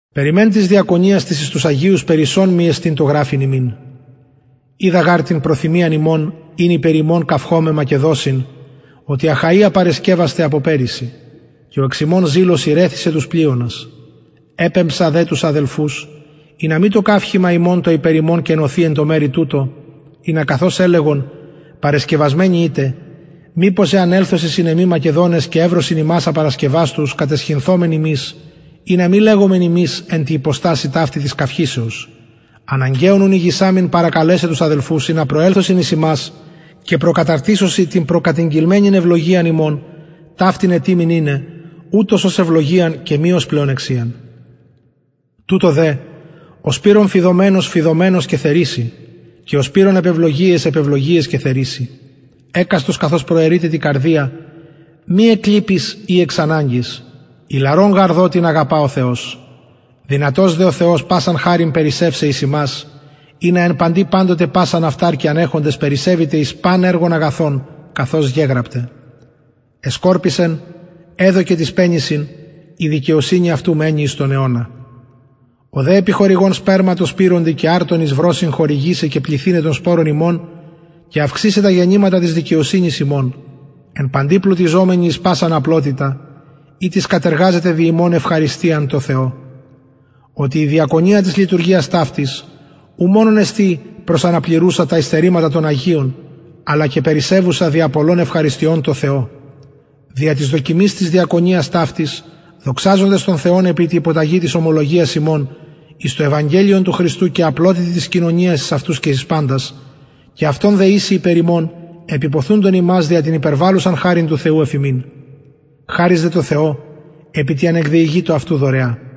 περι μεν γαρ της διακονιας της εις τους αγιους περισσον μοι εστιν το γραφειν υμιν οιδα γαρ την προθυμιαν υμων ην υπερ υμων καυχωμαι μακεδοσιν οτι αχαια παρεσκευασται απο περυσι και ο εξ υμων ζηλος ηρεθισεν τους πλειονας επεμψα δε τους αδελφους ινα μη το καυχημα ημων το υπερ υμων κενωθη εν τω μερει τουτω ινα καθως ελεγον παρεσκευασμενοι ητε μηπως εαν ελθωσιν συν εμοι μακεδονες και ευρωσιν υμας απαρασκευαστους καταισχυνθωμεν ημεις ινα μη λεγωμεν υμεις εν τη υποστασει ταυτη της καυχησεως αναγκαιον ουν ηγησαμην παρακαλεσαι τους αδελφους ινα προελθωσιν εις υμας και προκαταρτισωσιν την προκατηγγελμενην ευλογιαν υμων ταυτην ετοιμην ειναι ουτως ως ευλογιαν και μη ως πλεονεξιαν τουτο δε ο σπειρων φειδομενως φειδομενως και θερισει και ο σπειρων επ ευλογιαις επ ευλογιαις και θερισει εκαστος καθως προαιρειται τη καρδια μη εκ λυπης η εξ αναγκης ιλαρον γαρ δοτην αγαπα ο θεος δυνατος δε ο θεος πασαν χαριν περισσευσαι εις υμας ινα εν παντι παντοτε πασαν αυταρκειαν εχοντες περισσευητε εις παν εργον αγαθον καθως γεγραπται εσκορπισεν εδωκεν τοις πενησιν η δικαιοσυνη αυτου μενει εις τον αιωνα ο δε επιχορηγων σπερμα τω σπειροντι και αρτον εις βρωσιν χορηγησαι και πληθυναι τον σπορον υμων και αυξησαι τα γενηματα της δικαιοσυνης υμων εν παντι πλουτιζομενοι εις πασαν απλοτητα ητις κατεργαζεται δι ημων ευχαριστιαν τω θεω οτι η διακονια της λειτουργιας ταυτης ου μονον εστιν προσαναπληρουσα τα υστερηματα των αγιων αλλα και περισσευουσα δια πολλων ευχαριστιων τω θεω δια της δοκιμης της διακονιας ταυτης δοξαζοντες τον θεον επι τη υποταγη της ομολογιας υμων εις το ευαγγελιον του χριστου και απλοτητι της κοινωνιας εις αυτους και εις παντας και αυτων δεησει υπερ υμων επιποθουντων υμας δια την υπερβαλλουσαν χαριν του θεου εφ υμιν χαρις δε τω θεω επι τη ανεκδιηγητω αυτου δωρεα